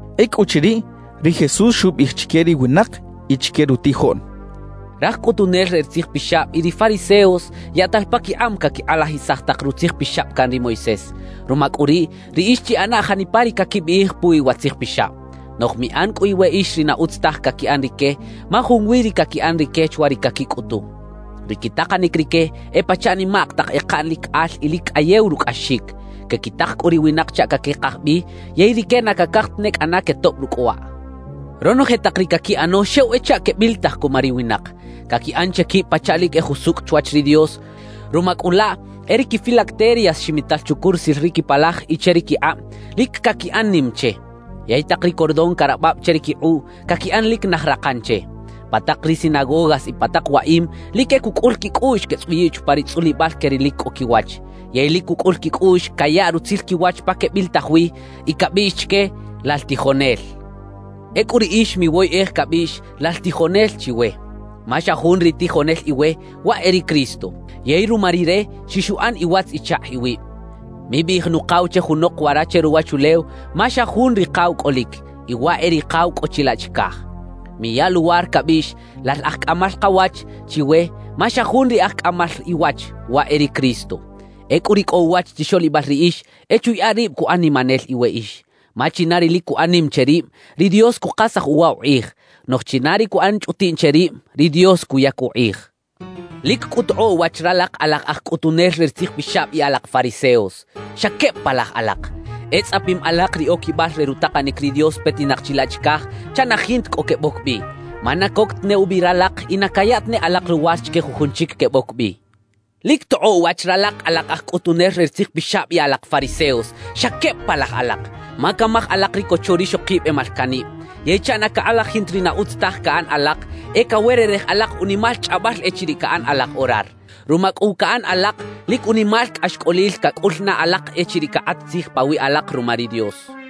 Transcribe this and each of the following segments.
Ecꞌuchiriꞌ, ri Jesús xubiꞌij chique ri winak y chique rutijoꞌn: «Raj cꞌutunel re ri tzijpixab y ri fariseos yaꞌtal paquikꞌab caquikꞌalajisaj tak rutzijpixab can ri Moisés. Ruma cꞌu riꞌ, riꞌix chiꞌana janipa ri caquibiꞌij puwi wa tzijpixab; noꞌj miꞌan cꞌu iweꞌix ri na utz taj caquiꞌan rique, ma junwi ri caquiꞌan rique chwa ri caquicꞌutu. »Ri quitakanic rique e pachaꞌ nimak tak ekaꞌn lic al y lic cꞌayew rucꞌaxic; quequitak cꞌu ri winak chaꞌ caquekaj bi yey rique na cacaj tane cꞌana quetoꞌb rucꞌ waꞌ. »Ronoje tak ri caquiꞌano xew e chaꞌ quebilitaj cuma ri winak. Caquiꞌan che quib pachaꞌ lic e jusucꞌ chwach ri Dios; ruma cꞌu laꞌ, e ri quifilacterias ximital chucurusil ri quipalaj y che ri quikꞌab, lic caquiꞌan nim che; yey tak ri cordón carabab che ri quikꞌuꞌ, caquiꞌan lic naj rakan che. Pa tak ri sinagogas y pa tak waꞌim, lic e cucꞌul quicꞌuꞌx quetzꞌuyiꞌ chupa ri tzꞌulibal que ri lic cꞌo quiwach. Yey lic cucꞌul quicꞌuꞌx cayaꞌ rutzil quiwach pa quebilitaj wi y cabiꞌx chique: “¡Lal tijonel!” »Ecꞌu riꞌix miwoyꞌej cabiꞌx “¡Lal tijonel!” chiwe, ma xa jun ri tijonel iwe, waꞌ e ri Cristo. Yey ruma Rire xixuꞌan iwatz-ichakꞌ iwib. Mibiꞌij “Nukaw” che junok wara che ruwachulew, ma xa jun Rikaw cꞌolic, y waꞌ e Rikaw cꞌo chilaꞌ chicaj. Miya luwar cabiꞌx “¡Lal Aj Cꞌamal Kawach!” chiwe, ma xa jun ri Aj Cꞌamal Iwach, waꞌ e ri Cristo. »Ecꞌu ri cꞌo uwach chixoꞌlibal riꞌix e chuyaꞌa rib cuꞌan nimanel iweꞌix. Ma china ri lic cuꞌan nim che rib, ri Dios cukasaj uwa ukꞌij; noꞌj china ri cuꞌan chꞌutiꞌn che rib, ri Dios cuyac ukꞌij. »¡Lic cꞌu tokꞌoꞌ wach ralak alak aj cꞌutunel re ri tzijpixab y alak fariseos! ¡Xa queb palaj alak! E tzꞌapim alak ri oquibal re rutakanic ri Dios petinak chilaꞌ chicaj chaꞌ na jinta cꞌo queboc bi; ma na coc tane ubi ralak y na caya tane alak luwar chique jujun chic queboc bi. »¡Lic tokꞌoꞌ wach ralak alak aj cꞌutunel re ri tzijpixab y alak fariseos! ¡Xa queb palaj alak! Ma camaj alak ri cocho rixokib e malcaꞌnib. Yey chaꞌ na cakꞌalajin ta ri na utz taj caꞌan alak, e cawererej alak unimal chꞌabal echiriꞌ caꞌan alak orar. Ruma cꞌu wa caꞌan alak, lic unimal cꞌaxcꞌolil cacꞌul na alak echiriꞌ cakꞌat tzij pawiꞌ alak ruma ri Dios.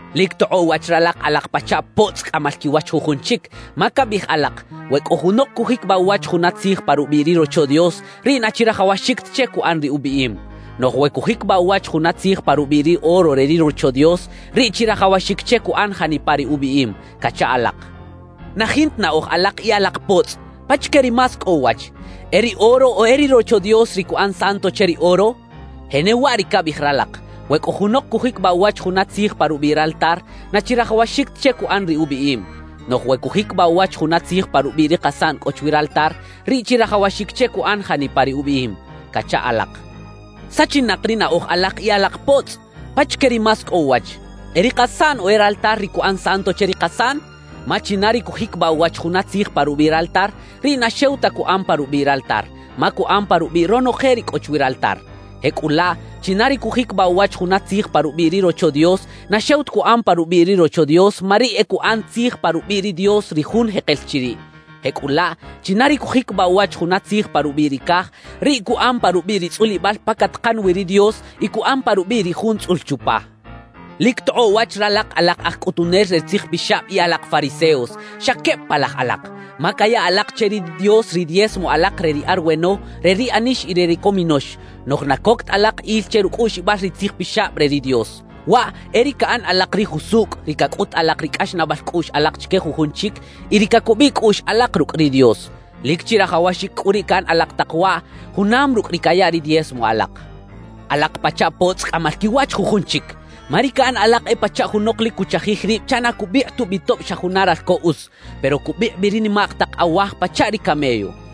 »Lic tokꞌoꞌ wach ralak alak pachaꞌ potzꞌ cꞌamal quiwach jujun chic, ma cabiꞌij alak: “We cꞌo junok cujiquibaꞌ uwach juna tzij pa rubiꞌ ri Rocho Dios, riꞌ na chirajawaxic ta che cuꞌan ri ubiꞌim; noꞌj we cujiquibaꞌ uwach juna tzij pa rubiꞌ ri oro re ri Rocho Dios, riꞌ chirajawaxic che cuꞌan janipa ri ubiꞌim” cacha alak. »¡Na jinta naꞌoj alak y alak potzꞌ! ¿Pachique ri más cꞌo uwach? ¿E ri oro o e ri Rocho Dios, ri cuꞌan santo che ri oro? Jenewaꞌ ri cabiꞌij ralak: “We cꞌo junok cujiquibaꞌ uwach juna tzij pa rubiꞌ raltar, na chirajawaxic ta che cuꞌan ri ubiꞌim; noꞌj we cujiquibaꞌ uwach juna tzij pa rubiꞌ ri kasaꞌn cꞌo chwi raltar, riꞌ chirajawaxic che cuꞌan janipa ri ubiꞌim” cacha alak. »¡Sachinak ri naꞌoj alak y alak potzꞌ! ¿Pachique ri más cꞌo uwach? ¿E ri kasaꞌn o e raltar ri cuꞌan santo che ri kasaꞌn? Ma china ri cujiquibaꞌ uwach juna tzij pa rubiꞌ raltar, riꞌ na xew ta cuꞌan pa rubiꞌ raltar, ma cuꞌan pa rubiꞌ ronoje ri cꞌo chwi raltar. Jecꞌulaꞌ, china ri cujiquibaꞌ uwach juna tzij pa rubiꞌ ri Rocho Dios, na xew ta cuꞌan pa rubiꞌ ri Rocho Dios, ma riꞌ e cuꞌan tzij pa rubiꞌ ri Dios, ri Jun jekel chiriꞌ. Jecꞌulaꞌ, china ri cujiquibaꞌ uwach juna tzij pa rubiꞌ ri caj, riꞌ cuꞌan pa rubiꞌ ri tzꞌulibal pa catakan wi ri Dios y cuꞌan pa rubiꞌ ri Jun tzꞌul chupa. »¡Lic tokꞌoꞌ wach ralak alak aj cꞌutunel re ri tzijpixab y alak fariseos! ¡Xa queb palaj alak! Ma caya alak che ri Dios ri diezmo alak re ri arweno, re ri anix y re ri cominox. Noꞌj na coc ta alak il che rucꞌuꞌxibal ri Tzij Pixab re ri Dios: Waꞌ e ri caꞌan alak ri usucꞌ, ri cacꞌut alak ri cꞌaxnaꞌbal cꞌuꞌx alak chique jujun chic y ri cacubiꞌ cꞌuꞌx alak rucꞌ ri Dios. Lic chirajawaxic cꞌu riꞌ caꞌan alak tak waꞌ, junam rucꞌ ri caya ri diezmo alak. »¡Alak pachaꞌ potzꞌ cꞌamal quiwach jujun chic! Ma ri caꞌan alak e pachaꞌ junok lic cuchajij rib chaꞌ na cubikꞌ tubi tob xa juna ralco us, pero cubikꞌ bi ri nimak tak awaj pachaꞌ ri camello.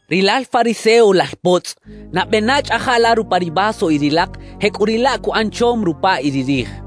¡Rilal fariseo, lal potzꞌ! Nabe na chꞌaja la rupa ri vaso y ri lak; jecꞌuriꞌlaꞌ cuꞌan chom rupa y ri rij.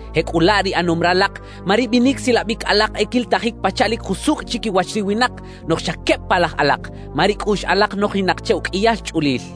Jecꞌulaꞌ ri ꞌanom ralak, ma ri binic silabic alak e quilitajic pachaꞌ lic jusucꞌ chiquiwach ri winak; noꞌj xa queb palaj alak, ma ri cꞌuꞌx alak nojinak che uqꞌuiyal chꞌulil.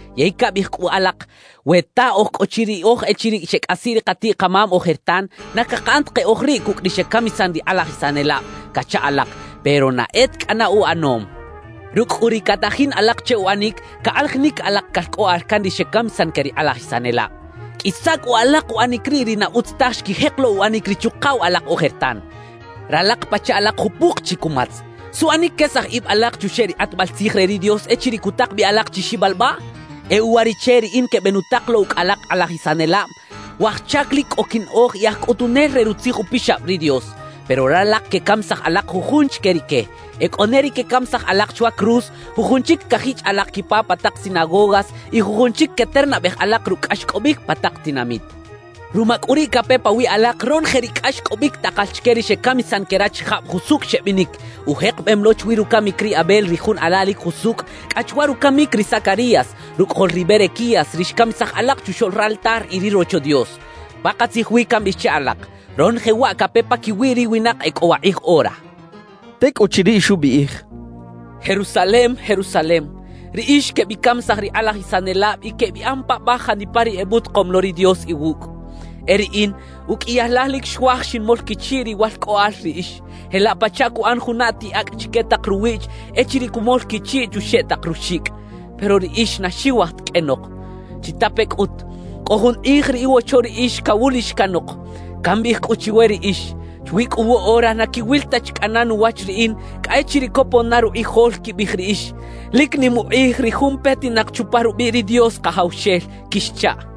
Yey cabiꞌij cꞌu alak: “We ta oj cꞌo chi riꞌoj echiriꞌ xecꞌasiꞌ ri katiꞌ-kamam ojertan, na cakaꞌan ta keꞌoj riꞌ cucꞌ ri xecamisan ri kꞌalajisanelab” cacha alak. Pero ¡na e ta cꞌana uꞌanom! Rucꞌ cꞌu ri catajin alak che uꞌanic, cakꞌalajinic alak calcꞌoꞌal can ri xecamisan que ri kꞌalajisanelab. ¡Qꞌuisa cꞌu alak uꞌanic riꞌ ri na utz taj xquijek lo uꞌanic ri chuꞌkaw alak ojertan! »¡Ralak pachaꞌ alak jupuk chi cumatz! ¿Suꞌanic quesaj ib alak chuxeꞌ ri kꞌatbal tzij re ri Dios echiriꞌ cutak bi alak chi xibalbaꞌ? E uwariꞌche riꞌin quebenutak lo ucꞌ alak kꞌalajisanelab, waj chac lic cꞌo quinaꞌoj y aj cꞌutunel re Rutzij Upixab ri Dios. Pero ralak quecamisaj alak jujun chique rique. E cꞌo ne ri quecamisaj alak chwa cruz, jujun chic cajichꞌ alak quipa pa tak sinagogas y jujun chic queternabej alak rucꞌ cꞌaxcꞌobic pa tak tinamit. Ruma cꞌu riꞌ cape pawiꞌ alak ronoje ri cꞌaxcꞌobic takal chique ri xecamisan que rachijab jusucꞌ xebinic, ujekebem lo chwi rucamic ri Abel ri jun ala lic jusucꞌ, cꞌa chwa rucamic ri Zacarías, rucꞌajol ri Berequías, ri xcamisaj alak chuxoꞌl raltar y ri Rocho Dios. Pakatzij wi cambiꞌij che alak: Ronoje waꞌ cape paquiwi ri winak e cꞌo wakꞌij ora» xchaꞌ. Tecꞌuchiriꞌ, xubiꞌij: «¡Jerusalem, Jerusalem, riꞌix quebicamisaj ri kꞌalajisanelab y quebiꞌan paꞌbaj janipa ri ebutakom lo ri Dios iwucꞌ! E riꞌin, uqꞌuiyal laj lic xuaj xinmol quichiꞌ riwalcꞌoꞌal riꞌix, jelaꞌ pachaꞌ cuꞌan juna atiꞌ acꞌ chique tak ruwiꞌch echiriꞌ cumol quichiꞌ chuxeꞌ tak ruxicꞌ; pero riꞌix na xiwaj ta qꞌuenok. »Chitape cꞌut: Cꞌo jun kꞌij ri iwocho riꞌix cawulix canok. Cambiꞌij cꞌu chiwe riꞌix: Chwi cꞌu woꞌora na quiwil ta chi cꞌana nuwach riꞌin cꞌa echiriꞌ copon na rukꞌijol quibiꞌij riꞌix: Lic nim ukꞌij ri jun petinak chupa rubiꞌ ri Dios Kajawxel quixchaꞌ.»